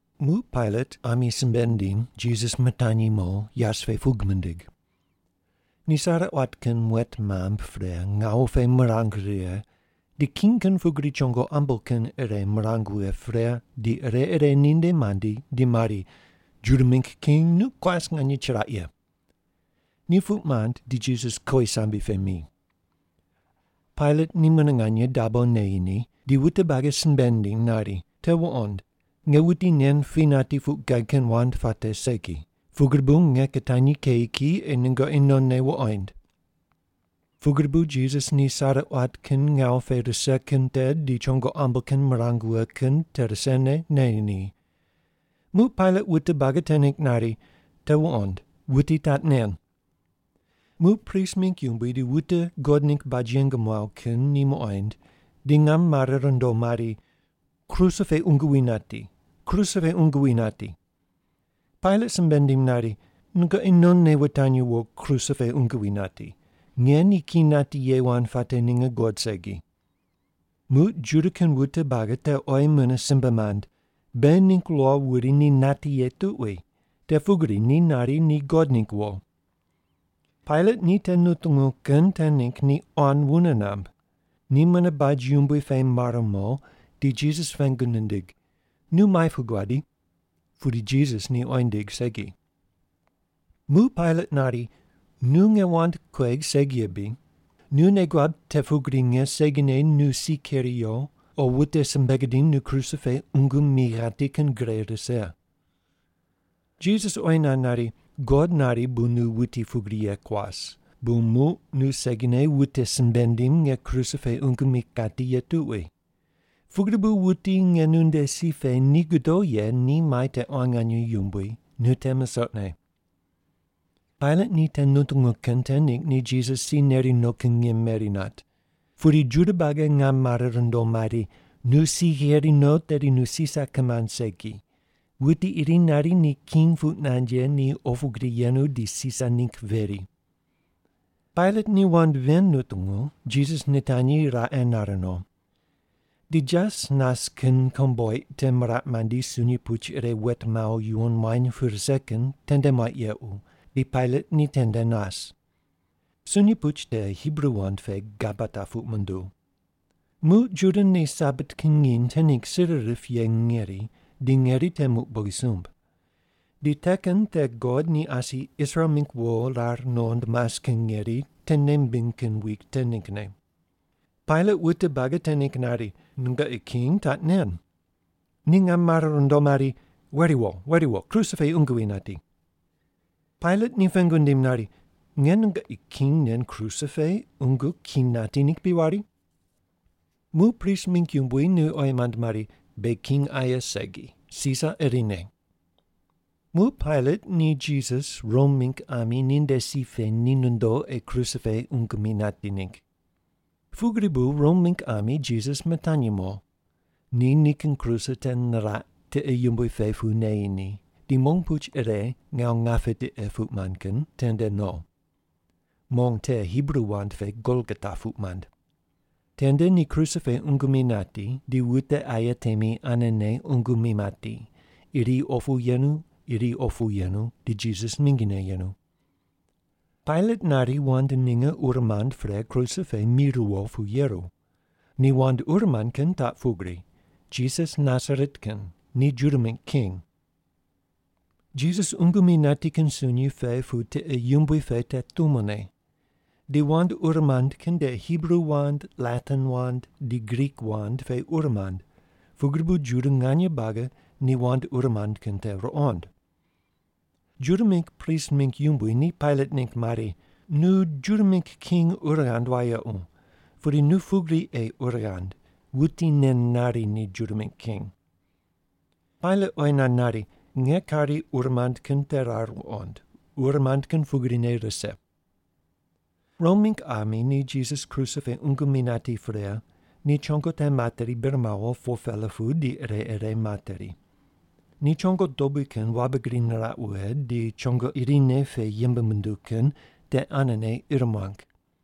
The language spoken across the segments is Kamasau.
Muq Pailat ami simbe nindim, Jisas mitanyi mo yas pe pug mindig. Ni sare quat kin muet mamb pre ngawu pe mirang righe, di king kin pugri chongo ambo kin ire mirang wughe pre, di ire ire ninde mandi di mari, “Juda mingg king nu kuas nganye chiraq ye!” Ni puq mand di Jisas kowisambe pe mi. Pailat ni mune nganye dabo neyi ni di wute buagi simbe nindiny nari, “Te wuqond! Nge wuti nen pi nati puq gad kin wand puate segi, pugri bu nge kitanyi keyi ki ei nungoqi nonne wuqoind.” Pugri bu Jisas ni sare quat kin ngawu pe rise kin te di chongo ambo kin mirang wughe kin te risene neyi ni. Muq Pailat wute buagi te ningg nari, “Te wuqond. Wuti taq nen.” Muq prist mingg yumbui di wute God ningg baj yeng muaw kin ni muqoind di ngam mare rundo mari, “Kruse pe qungu wi nati. Kruse pe qungu wi nati.” Pailat simbe nindim nari, “Nungoqi nonne wutanyi wo kruse pe qungu wi nati. Nge ni ki nati ye wand puate ninge guqod segi.” Muq Juda kin wute buagi te oyi mune simbe mand, “Beghi ningg lo wuri ni nati ye tuqui, te pugri ni nari ni God ningg wo.” Pailat ni te nutungu kin te ningg ni quan wune namb. Ni mune baj yumbui pe mar mo, di Jisas pengu nindig, “Nu muai pu guadi?” Pudi Jisas ni oyi nindig segi. Muq Pailat nari, “Nu nge wand kuegh segi ye bri? Nu nei guab te pugri nge segine nu si keri yo, o wute simbe gidim nu kruse pe qungu mi ghati kin gre rise.” Jisas oyi nand nari, “God nari bu nu wuti pugri ye kuas, bu muq nu segine wute simbe ndim nge kruse pe qungu mi kati ye tuqui. Pugri bu wuti nge nu nde si pe ni godo ye ni mai te quan nganye yumbui, nu te musoqne.” Pailat ni te nutungu kin te ningg ni Jisas si neri no kin ngim meri nat. Pudi Juda buagi ngam mare rundo mari, “Nu si gheri no, tedi nu Sisar kimand segi! Wuti iri nari ni king puq nand ye ni opu gri yenu, di Sisar ningg veri!” Pailat ni wand ven nutungu, Jisas nitanyi raqe nar no. Di jas nas kin komboiq te miraq mandi sunyi puch ire wet mawo yuwon muany pu rise kin tende muaq yequ di Pailat ni tende nas. (Sunyi puch te Hibru wand pe Gabata puq munduw.) Muq Juda ni Sabat kin nginy te ningg sir rip ye ngeri di ngeri te muq bogisumb. Di te kin te God ni asi Israel mingg wo rar nuqond mas kin ngeri te nei mimbiny kin wik te ninggne. Pailat wute buagi te ningg nari, “Nungoqi king taq nen.” Ni ngam mare rundo mari, “Weri wo! Weri wo! Kruse pe qungu wi nati!” Pailat ni pengu nindim nari, “Nge nungoqi king nen kruse pe qungu ki nati ningg bri wari?” Muq prist mingg yumbui ni oyi mand mari, “Beghi king aye segi, Sisar irine!” Muq Pailat ni Jisas Rom mingg ami ninde si pe ni nondo ei kruse pe qungu mi nati ningg. Pugri bu Rom mingg ami Jisas mitanyi mo. Ni nikin kruse te niraq tiqe yumbui pe pu neyi ni, di mong puch ire “Ngawu ngape tiqe” puq mand kin tende no. (Mong te Hibru wand pe Golgota puq mand.) Tende ni kruse pe qungu mi nati, di wute aye temi anene qungu mi mati, iri opu yenu iri opu yenu di Jisas mingine yenu. Pailat nari wand ninge ur mand pre kruse pe mi riwo pu yeru. Ni wand ur mand kin taq pugri, “Jisas Nasaret kin, ni Juda mingg king.” Jisas qungu mi nati kin sunyi pe pu tiqe yumbui pe te tumone. Di wand ur mand kin te Hibru wand, Latin wand, di Grik wand pe ur mand, pugri bu Juda nganye buagi ni wand ur mand kin te ruqond. Juda mingg prist mingg yumbui ni Pailat ningg mari, “Nu Juda mingg king ur ghand wayequ. Pudi nu pugri ei ur ghand, ‘Wuti nen nari ni Juda mingg king’.” Pailat oyi nand nari, “Nge kari ur mand kin te rar wuqond, ur mand kin pugrine rise.” Rom mingg ami ni Jisas kruse pe qungu mi nati pre, ni chongo te materi bir mawo 4-pela pu di ire ire materi. Ni chongo dobui kin wabe gri niraq wughe, di chongo irine pe yembe munduw kin te anene ir muang.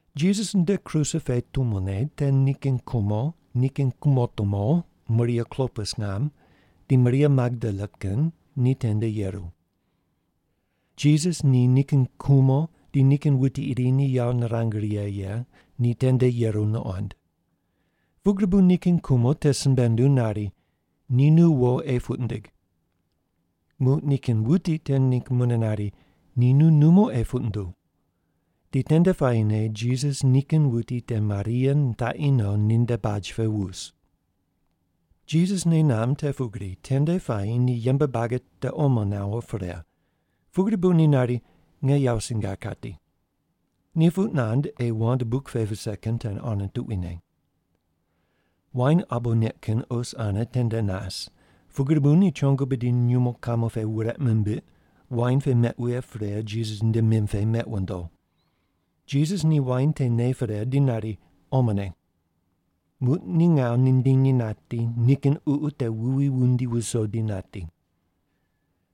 Jisas nde kruse pe tumone te nikin kumo, nikin kumotumo, Maria Klopas ngam, di Maria Magdala kin ni tende yeru. Jisas ni nikin kumo di nikin wuti iri ni yawo nirang righe ye ni tende yeru nuqond. Pugri bu nikin kumo te simbe nunduw nari, “Ni nu wo ei puq ndig.” Muq nikin wuti te ningg mune nari, “Ni nu numo ei puq nduw.” Di tende puayine Jisas nikin wuti te Maria nitaqi no ninde baj pe wus. Jisas nei namb te pugri tende puayi ni yembe buagi te omo nawo pre, pugri bu ni nari, “Nge yawo singar kati.” Ni puq nand ei wand buk pe vise kin te ane tuquine. Wain abo neq kin os ane tende nas, pugri bu ni chongo bidi nyumo kamo pe wureq mimbiq, wain pe meq wughe pre Jisas nde mim pe meq wundo. Jisas ni wain te ne pre di nari, “Omone.” Muq ni ngawu nindinyi nati, nikin ququ te wuwi wundi wuso di nati.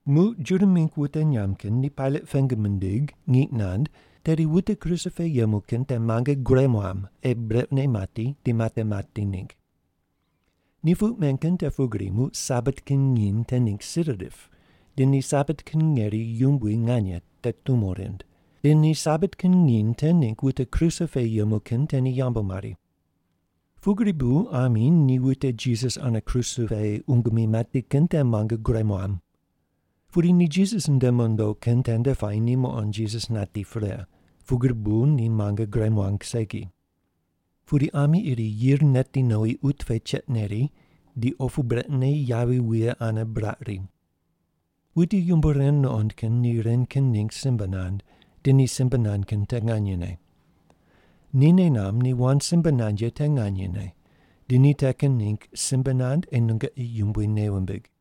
Muq Juda mingg wute nyamb kin ni Pailat pengu mindig ngiq nand tedi wute kruse pe yemu kin te muange gure muam ei brequne mati di mate mati ningg. Ni puq men kin te pugri muq Sabat kin nginy te ningg sir rip di ni Sabat kin ngeri yumbui nganye te tumo rind, di ni Sabat kin nginy te ningg wute kruse pe yemu kin te ni yambu mari. Pugri bu ami ni wute Jisas ane kruse pe qungu mi mati kin te muange gure muam. Pudi ni Jisas nde mondo kin tende puayi ni muqond Jisas nati pre, pugri bu ni muange gure muang segi. Pudi ami iri yir neti nowi qut pe cheiq neri, di opu brequne yavi wuye ane buraq ri. Wuti yumbo ren nuqond kin ni ren kin ningg simbe nand, di ni simbe nand kin te nganyene. Ni nei namb ni wand simbe nand ye te nganyene, di ni te kin ningg simbe nand ei nungoqi Yumbui nei wumbig.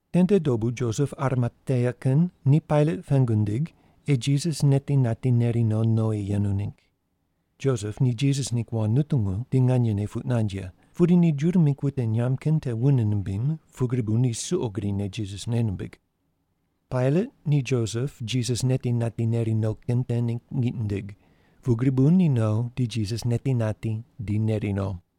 Tende dobu Josep Arimatea kin ni Pailat pengu nindig ei Jisas neti nati neri no nowi yenu ningg. (Josep ni Jisas ningg wand nutungu di nganyene puq nand ye, pudi ni Juda mingg wute nyamb kin te wune nimbim, pugri bu ni suqo grine Jisas nei nimbig.) Pailat ni Josep Jisas neti nati neri no kin te ningg ngiq nindig, pugri bu ni no di Jisas neti nati, di neri no.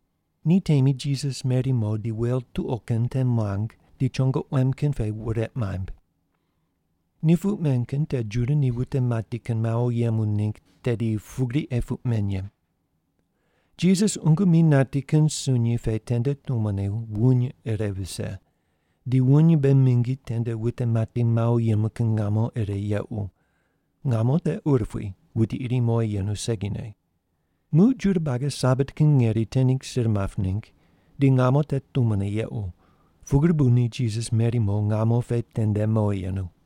Ni temi Jisas meri mo di wel tuqo kin te muang di chongo quem kin pe wureq maimb. Ni puq men kin te Juda ni wute mati kin mawo yemu ningg tedi pugri ei puq men ye. Jisas qungu mi nati kin sunyi pe tende tumone wuny ire vise, di wuny mbe mingi tende wute mati mawo yemu kin ngamo ire yequ, ngamo te urupui, wuti iri mowi yenu segine. Muq Juda buagi Sabat kin ngeri te ningg sir map ningg, di ngamo te tumone yequ, pugri bu ni Jisas meri mo ngamo pe tende mowi yenu.